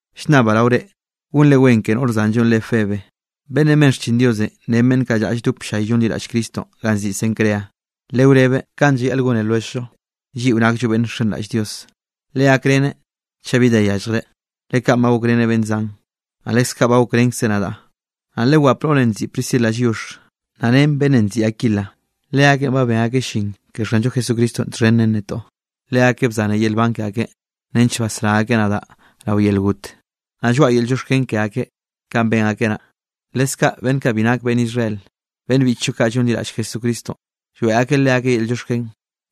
Llnnabaꞌ rao reꞌ, gonre wen ke noꞌr zanllonꞌ re Febenꞌ, beꞌnnenꞌ ben xchin Dios ren beꞌnn kaꞌ lldop ll-llay llonliraꞌll Cristonꞌ ganꞌ nziꞌi Cencrea. Lewrebeꞌ kanꞌ llayaꞌl gone lwelljllo, lliꞌo nakllo beꞌnn nxenraꞌll Dios. Legakreneꞌ chaꞌ bi da yalljreꞌ, le kaꞌn ba gokreneꞌ beꞌnn zan, naꞌ leskaꞌ ba gokrenkzeꞌ nadaꞌ. Naꞌ lewap noꞌrenꞌ nziꞌi Priscilanꞌ lliox, naꞌ ren beꞌnnenꞌ nziꞌi Aquila. Leakeꞌn ba ben akeꞌ llin ke Xanllo Jesucristonꞌ txhen ren netoꞌ. Leakeꞌ bzane yel nban ke akeꞌ nench basrá akeꞌ nadaꞌ rao yel got. Naꞌ lloaꞌa yel llioxken ke akeꞌ kanꞌ ben akeꞌ naꞌ. Leskaꞌ beꞌnn kaꞌ bi nak beꞌnn Israel, beꞌnn biꞌchllo kaꞌ llonliraꞌll Jesucristonꞌ, lloeꞌ akeꞌ leakeꞌ yel llioxken.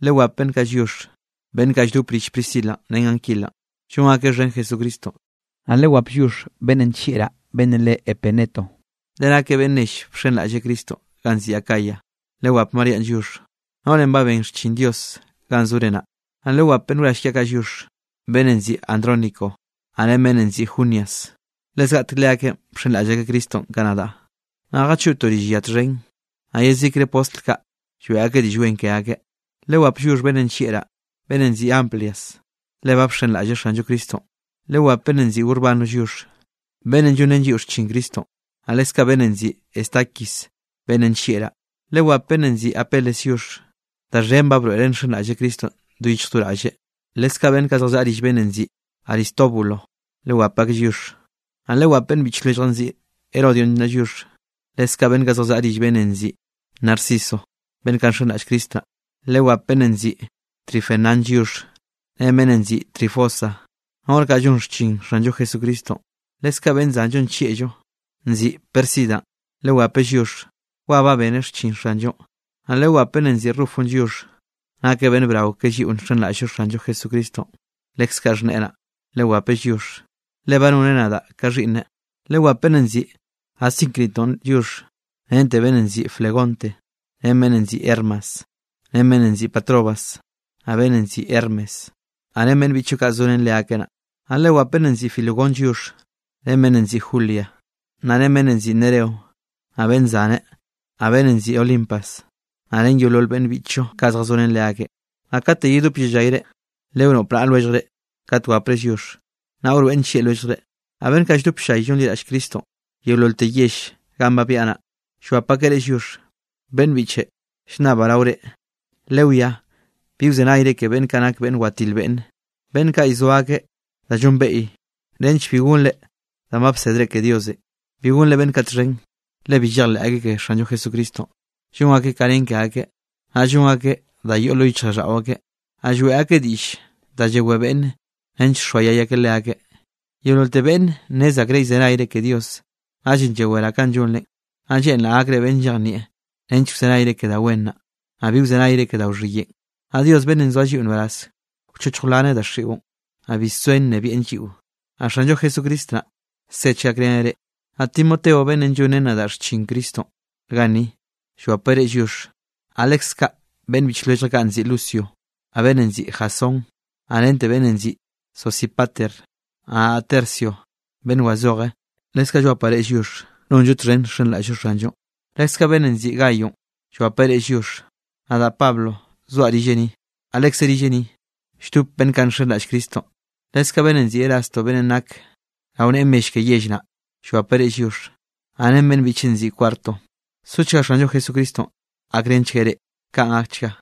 Lewap beꞌnn kaꞌ lliox, beꞌnn kaꞌ lldop rill Priscilanꞌ ren Aquila, llon akeꞌ xhen Jesucristonꞌ. Naꞌ lewap lliox beꞌnnenꞌ nllieꞌraꞌ, beꞌnnenꞌ re Epeneto, le nakeꞌ beꞌnn nell bxenraꞌlle Cristonꞌ ganꞌ nziꞌi Acayanꞌ. Naꞌ lewap Maríanꞌ lliox, noꞌrenꞌ ba ben xchin Dios ganꞌ zore naꞌ. Naꞌ lewap beꞌnn wrall kiaꞌ kaꞌ lliox, beꞌnnenꞌ nziꞌi Andrónico, naꞌ ren beꞌnnenꞌ nziꞌi Junias. Le zgaꞌtek leakeꞌn bxenraꞌll akeꞌ Cristonꞌ ka nadaꞌ, naꞌ jachoꞌtoꞌ rill ya txhen. Naꞌ yezikre postl kaꞌ lloeꞌ akeꞌ diꞌll wen ke akeꞌ. Lewap lliox beꞌnnenꞌ nllieꞌraꞌ, beꞌnnenꞌ nziꞌi Amplias, le ba nxenraꞌlleꞌ Xanllo Cristonꞌ. Lewap beꞌnnenꞌ nziꞌi Urbano lliox, beꞌnnenꞌ llonrén lliꞌo xchin Cristonꞌ, naꞌ leskaꞌ beꞌnn nziꞌi Estaquis, beꞌnnenꞌ nllieꞌraꞌ. Lewap beꞌnnenꞌ nziꞌi Apeles lliox. Da xhen ba broeꞌreꞌ nxenraꞌlleꞌ Cristonꞌ do yichj do raꞌlleꞌ. Leskaꞌ beꞌnn kaꞌ zjallaꞌa rill beꞌnnenꞌ nziꞌi Aristóbulo, lewap akeꞌ lliox. Naꞌ lewap beꞌnn biꞌch lwelljaꞌ nziꞌi Herodión naꞌ lliox, leskaꞌ beꞌnn kaꞌ zjallaꞌa rill beꞌnnenꞌ nziꞌi Narciso, beꞌnn kaꞌ nxenraꞌll Cristo naꞌ. Lewap beꞌnnenꞌ nziꞌi Trifenanꞌ lliox ren beꞌnnenꞌ nziꞌi Trifosa, noꞌr kaꞌ llon xchin Xanllo Jesucristonꞌ. Leskaꞌ beꞌnn zanllo nllieꞌllo nziꞌi Pérsidanꞌ, lewapeꞌ lliox, wa ba beneꞌ xchin Xanllonꞌ. Naꞌ lewap beꞌnnenꞌ nziꞌi Rufonꞌ lliox, nakeꞌ beꞌnn brao ke lliꞌo nxenraꞌll Xanllo Jesucristonꞌ. Leskaꞌ xhneꞌe naꞌ, lewapeꞌ lliox, le ba noneꞌ nadaꞌ ka xhiꞌnneꞌ. Lewap beꞌnnenꞌ nziꞌi Asíncritonꞌ lliox, rente beꞌnnenꞌ nziꞌi Flegonte, ren beꞌnnenꞌ nziꞌi Hermas, ren beꞌnnenꞌ nziꞌi Patrobas, naꞌ beꞌnnenꞌ nziꞌi Hermes, naꞌ ren beꞌnn biꞌchllo kaꞌ zorén leakeꞌ naꞌ. Naꞌ lewap beꞌnnenꞌ nziꞌi Filólogonꞌ lliox ren beꞌnnenꞌ nziꞌi Julia, naꞌ ren beꞌnnenꞌ nziꞌi Nereo, naꞌ beꞌnn zaneꞌ, naꞌ beꞌnnenꞌ nziꞌi Olimpas, naꞌ ren yeolol beꞌnn biꞌchllo kaꞌ zjazorén leakeꞌ. Naꞌ kate yedop yellayre, lewnoꞌp naꞌa lwelljre kat wapre lliox, naꞌ wroeꞌn nllieꞌ lwelljre. Naꞌ beꞌnn kaꞌ lldop ll-llay llonliraꞌll akeꞌ Cristonꞌ yeololte yell ganꞌ ba byaꞌa naꞌ, llwap akeꞌ reꞌ lliox. Beꞌnn biꞌche, llnnabaꞌ rao reꞌ, lewiá bi wzenayre ke beꞌnn kaꞌ nak beꞌnn watil beꞌnne, beꞌnn kaꞌ llzoa da llonbeꞌy nench bi gonre danꞌ ba bsedre ke Diosenꞌ. Bi gonre beꞌnn kaꞌ txhen. Le bi llejleꞌ akeꞌ ke Xanllo Jesucristonꞌ, llon akeꞌ ka nen ke akeꞌ, naꞌ llon akeꞌ da yoꞌ lo yichjraꞌlldaꞌo akeꞌ. Naꞌ lloeꞌ akeꞌ diꞌll da yewé beꞌnne nench llxoayay akeꞌ leakeꞌ. Yeololte beꞌnne nnez akreꞌ llzenayre ke Diosenꞌ, naꞌllenꞌ llaweraꞌ kanꞌ llonrenꞌ. Naꞌ lleꞌnraꞌ gakre beꞌnn llejnieꞌ nench wzenayre ke da wen naꞌ, naꞌ bi wzenayre ke da wxhiyeꞌn. Naꞌ Dios beꞌnnenꞌ nzoa lliꞌo nbaraz, wchochj wlanchgueꞌ daxiꞌon, naꞌ bi soen nnebiaꞌn lliꞌo. Naꞌ Xanllo Jesucristo naꞌ, sechgueꞌ gakreneꞌ reꞌ. Naꞌ Timoteo beꞌnnenꞌ llonrén nadaꞌ xchin Cristonꞌ ganni, llwapeꞌ reꞌ lliox, naꞌ leskaꞌ beꞌnn biꞌch lwelljaꞌ kaꞌ nziꞌi Lucio, naꞌ beꞌnnenꞌ nziꞌi Jasón, naꞌ rente beꞌnnenꞌ nziꞌi Sosípater. Naꞌ nadaꞌ Tercio beꞌnn wazoje, leskaꞌ llwapaꞌ reꞌ lliox, nonllo txhen nxenraꞌll-llo Xanllonꞌ. Leskaꞌ beꞌnnenꞌ nziꞌi Gayonꞌ llwapeꞌ reꞌ lliox. Nadaꞌ Pablo zoaꞌ rilleꞌ ni, naꞌ lekze rilleꞌ ni, lldope beꞌnn kaꞌ nxenraꞌll Cristonꞌ. Leskaꞌ beꞌnnenꞌ nziꞌi Erasto beꞌnnenꞌ nakeꞌ rao neꞌe mell ke yell naꞌ, llwapeꞌ reꞌ lliox, naꞌ ren beꞌnn biꞌcheꞌn nziꞌi Cuarto. Sochga Xanllo Jesucristonꞌ gakrenchgueꞌ reꞌ. Kaꞌn gakchga.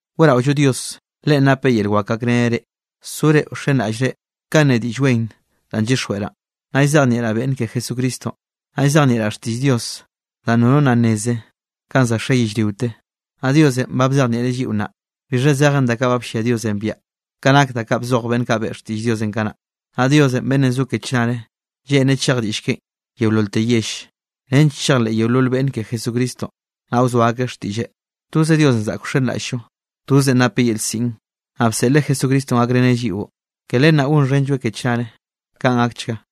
Weꞌraollo Dios. Leꞌen nap yel wak gakreneꞌ reꞌ, sore wxenraꞌllre kanꞌ ne Diꞌll Wen danꞌ llyixjweꞌraꞌn, naꞌ llzejnieꞌraꞌ beꞌnne ke Jesucristonꞌ. Naꞌ llzejnieꞌraꞌ xtiꞌll Dios danꞌ nono nna nneze kanꞌ za xe yellriote. Naꞌ Diosenꞌ ba bzejnieꞌreꞌ lliꞌo nnaꞌ, bixha zejen da kaꞌ bllia Diosenꞌ biaꞌa ka nak da kaꞌ bzoj beꞌnn kaꞌ beꞌe xtiꞌlleꞌn kanaꞌ. Naꞌ Dios beꞌnnenꞌ zo ke chnare lleꞌnreꞌ chej diꞌll keꞌen yeololte yell, nench chejleꞌ yeolol beꞌnne ke Jesucristonꞌ, naꞌ wzoa akeꞌ xtiꞌlleꞌ. Toze Diosenꞌ zaꞌk wxenraꞌll-llo, tozeꞌn napeꞌ yel siꞌn. Naꞌ bseꞌleꞌ Jesucristonꞌ gakreneꞌ lliꞌo, ke len naꞌ gonxhenlloeꞌ ke chnare. Kaꞌn gakchga.